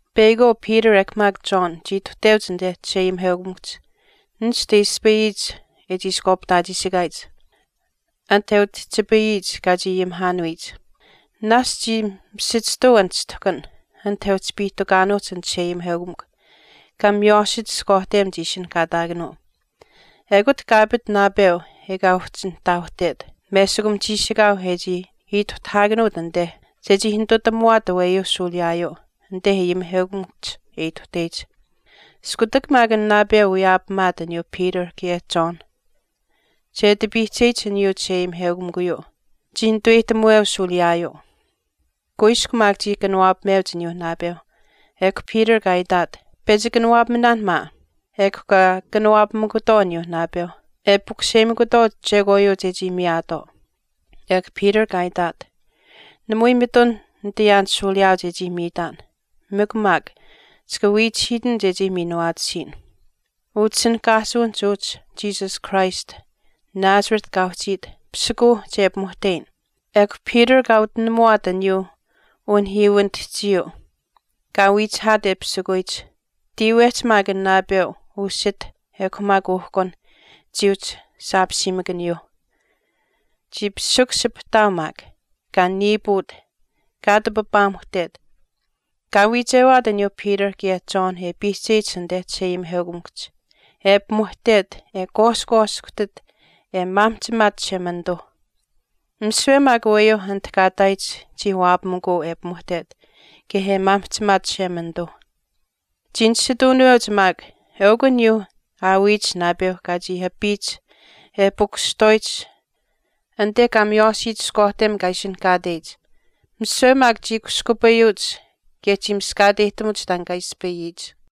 Peyakwaau Peter ekw maak John chii ituhteuch anite chisheayimiheukamikuhch nishtu e ispayiyich e chiishkwaapihtaachiishikaayich, anit e utihchipayiyich kaa chii ayimihaanuyich. Naashch chii misichihtuu an chishtuhkan anit e uhchi piihtukaanuuhch an chisheayimiheukamikw kaa miywaashich ishkwaahtem chii ishinihkaataakanuu, ekut kaa apit naapeu ekaa uhchi nihtaauhtet. Meshikum chiishikaau e chii ituhtahaakanuut anite, chechii nitutamuwaat aweyuu shuuliyaayuu anite ayimiheukamikuhch e ituhteyich. Iskutak maak an naapeu wiyaapamaat aniyuu Peter kaye John che ati piihcheyich aniyuu chisheayimiheukamikuyuu chii nituweyihtamuweu shuuliyaayuu. Kuiskw maak chii kanawaapameuch aniyuu naapeu, ekw Peter kaa itaat, “Pechi kanawaapaminaan maa.” Ekw kaa kanawaapamikutwaau aniyuu naapeuh, e pukuseyimikutwaau chekwaayuu chechii miyaatwaau. Ekw Peter kaa itaat, “Namui mitun nitayaan shuuliyaau chechii miitaan, mikw maak chika wiichihiitin chechii miinuwaatisiyin. Utishinihkaasuwinihch uhchi Jesus Christ Nazareth kaa uhchiit, pisikuuh che pimuhteyin.” Ekw Peter kaa utinamuwaat aniyuu unihiiwinitihchiyuu kaa wiichihaat e pisikuyich. Tiiwehch maak an naapeu, usit ekw maak uhkun chii uhchi saapiimikaniyuuh. Chii pisikushipihtaau maak, kaa niiput, kaa ati papaamuhtet. Kaa wiichewaat aniyuuh Peter kaye John e piihcheyich anite chisheayimiheukamikuhch, e pimuhtet, e kwaashkwaashkuhtit, e maamihchimaat Chishemanituu. Misiwe maak aweyuu anit kaa ihtaayich chii waapamikuu e pimuhtet kaye e maamihchimaat Chishemanituu. Chii nisituunuweuch maak eukw aniyuu aawiyich naapeu kaa chii apiyich e pikushihtwaayich anite kaa miywaashiyich ishkwaahtem kaa ishinihkaateyich. Misiwe maak chii kushkupayuuch kaye chii miskaateyihtamuch taan kaa ispayiyich.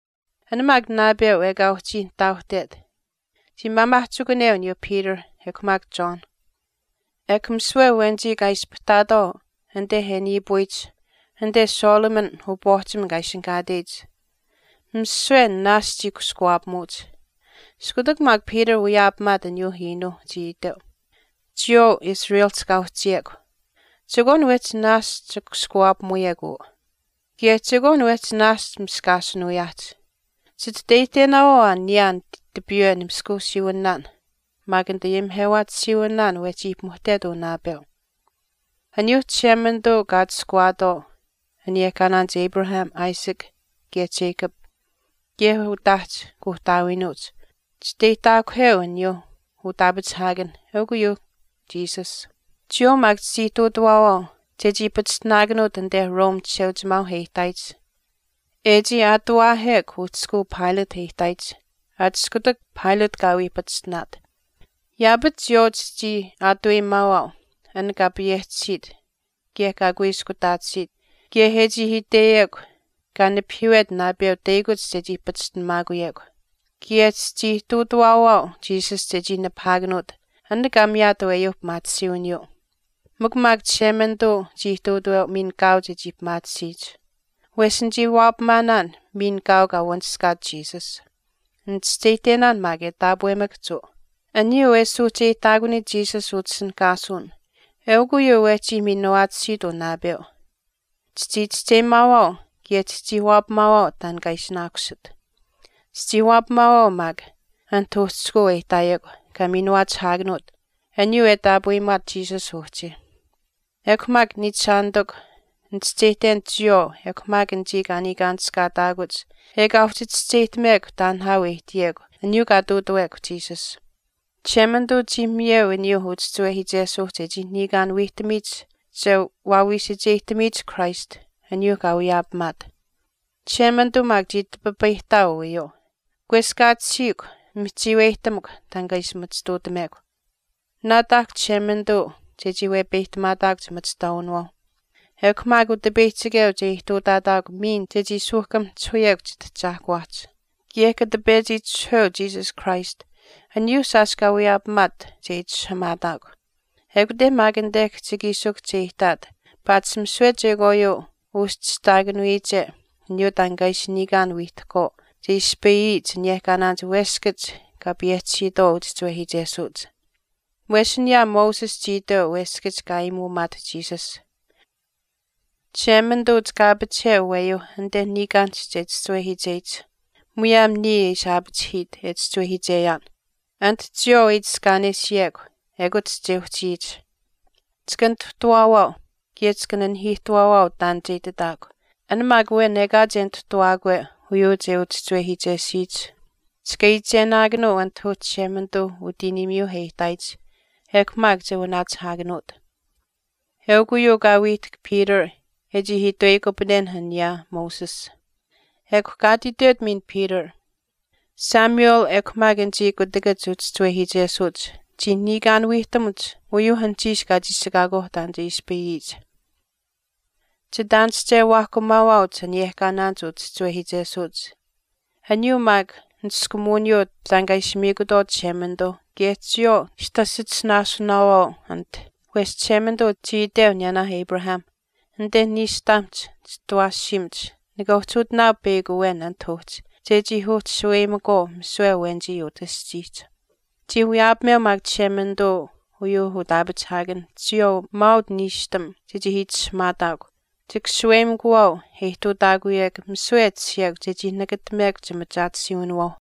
An maak naapeu ekaa uhchii nihtaauhtet chii maamaahchikuneu aniyuu Peter ekw maak John, ekw misiwe awenichii kaa ispahtaatwaau anite e niipuyich anite Solomon upwaahchim kaa ishinihkaateyich, misiwe naashch chii kushkuwaapamuuch. Iskutak maak Peter wiyaapamaat aniyuuh iinuuh, chii iteu, “Chiyawaau Israelihch kaa uhchiyekw, chekwaan wehchi naashch kushkuwaapamuyekw uu, kaye chekwaan naashch wehch miskaashinuuyaahch. Chititeyihtenaawaau aa niyaan tipiiwe nimaskuusiiwinaahch maak nitayimihewaatisiiwinaahch wehchii pimuhtet uu naapeu. Aniyuuh Chishemanituuh kaa atushkuwaatwaau aniyehkaanaanich, Abraham, Isaac kaye Jacob kaye utaahch kuuhtaawiinuuch chisteyihtaakuheu aniyuu utaapachihaakanh, eukw uyuuh Jesus. Chiyawaau maak chichii ihtuutuwaawaau chechii pachishtinaakanuut anite Rome Chisheuchimaau e ihtaayich. E chii aatuwaahekw uhchishkuu Pilate e ihtaayich, aat iskutak Pilate kaa wii pachishtinaat. Yaapach chiyawaau chichii aatuweyimaawaau an kaa payehchisiit kaye kaa kuiskutaatisiit kaye e chii itweyekw kaa nipahiiwet naapeu teyakuch chechii pachishtinamaakuyekw. Kaye chichii ihtuutawaawaau Jesus chechii nipahaakanuut an kaa miyaat aweyuu pimaatisiiwiniyuu. Mikw maak Chishemanituu chii ihtuutaweu miin kaau chechii pimaatisiyich. Wesh nichii waapamanaan miin kaau kaa wanishkaat Jesus. Nichischeyihtenaan maak e taapwemakahch uu. Aniyuu e suuhcheyihtaakuniyich Jesus utishinihkaasuwin eukw uyuu wehchi miinuwaatisiit uu naapeu. Chichii chischeyimaawaau kaye chichii waapamaawaau taan kaa ishinaakusit. Chichii waapamaawaau maak anit uhchishkuu e ihtaayekw kaa minuwaachihaakanuut aniyuu e taapweyimaat Jesus uhchi.” “Ekw maak niichishaanitikw, nichischeyihten chiyawaau ekw maak anichii kaa niikaanishkaataakuch ekaa uhchi chischeyihtamekw taan nihaau e ihtiyekw aniyuu kaa ihtuutawekw Jesus. Chishemanituu chii miyeu aniyuuh uchischiwehiichesuuh chechii niikaan wiihtamiyich che wawiisacheyihtamiyich Christ aniyuuh kaa wiyaapamaat. Chishemanituu maak chii tipipayihtaau uyuu. Kweskaatisiikw, mihchiiweyihtamukw taan kaa ishi machituutamekw. Naataahkw Chishemanituu chechii wepeyihtamaataakw chimachihtwaawinawaau. Ekw maak Utipeyihchikeu che ihtuutaataakw miin chechii suuhkamahchihuyekw chitahchaahkuwaahch. Kaye kata pechi itishahweu Jesus Christ, aniyuuh shaash kaa wiyaapamaat che itishahamaataakw. Ekute maak anite kihchikiishikuhch che ihtaat paatish misiwe chekwaayuu uschihtaakanuyiche aniyuu taan kaa ishi niikaan wiihtahkwaau che ispayiyich aniyehkaanaanich weskach kaa payehchisiitwaau uchischiwehiichesuuch. Wesh aniyaa Moses chii itweu weskach e aayimuumaat Jesus, Chishemanituu, chika aapachiheu aweyuu anite niikaanihch che chischiwehiicheyich, muyaam niya e ishi aapachihiit, e chischiwehiicheyaan. Anit chiyawaau e itiskaanesiyekw, ekut che uhchiyich. Chika nituhtawaawaau kaye chika nanihiihtuwaawaau taan che ititaakw. An maak awen ekaa che nituhtawaakwe uyuu che uchischiwehiichesuyich, chika iichenaakanuu anit uhchi Chishemanituu utiiniimiyuu e ihtaayich, ekw maak che wanaachihaakanuut. eukw uyuu kaa wiihtahk Peter e chii itweyikupanenh aniyaa Moses.” Ekw kaa ati itwet miin Peter, “Samuel ekw maak anichii kutakach uchischiwehiichesuuch chii niikaan wiihtamuch uyuu anuhchiish kaa chiishikaakwaauh taan ispayiyich. Chitaanische waahkumaawaauch aniyehkaanaanich uchischiwehiichesuuch, aniyuu maak niskumuwiniyuu taan kaa ishi miikutwaau Chishemanituu kaye chiyawaau chitasichisinaasunaawaau anit. Wesh Chishemanituu chii iteu aniyaanaah Abraham, Anite niishtaamihch chitawaashiimach nika uhchi uhtinaau peyakw awen anit uhchi chechii uhchi shaweyimakwaau misiwe awenichii utah aschiihch. Chii wiyaapameu maak Chishemanituu uyuuh utaapachihaakan chiyawaau maauch niishtam chechii itishahamaataakw. Chika shaweyimikuwaau e ihtuutaakuyekw misiwe e tashiyekw chechii nakatamekw chimachaatisiiwinawaauh.”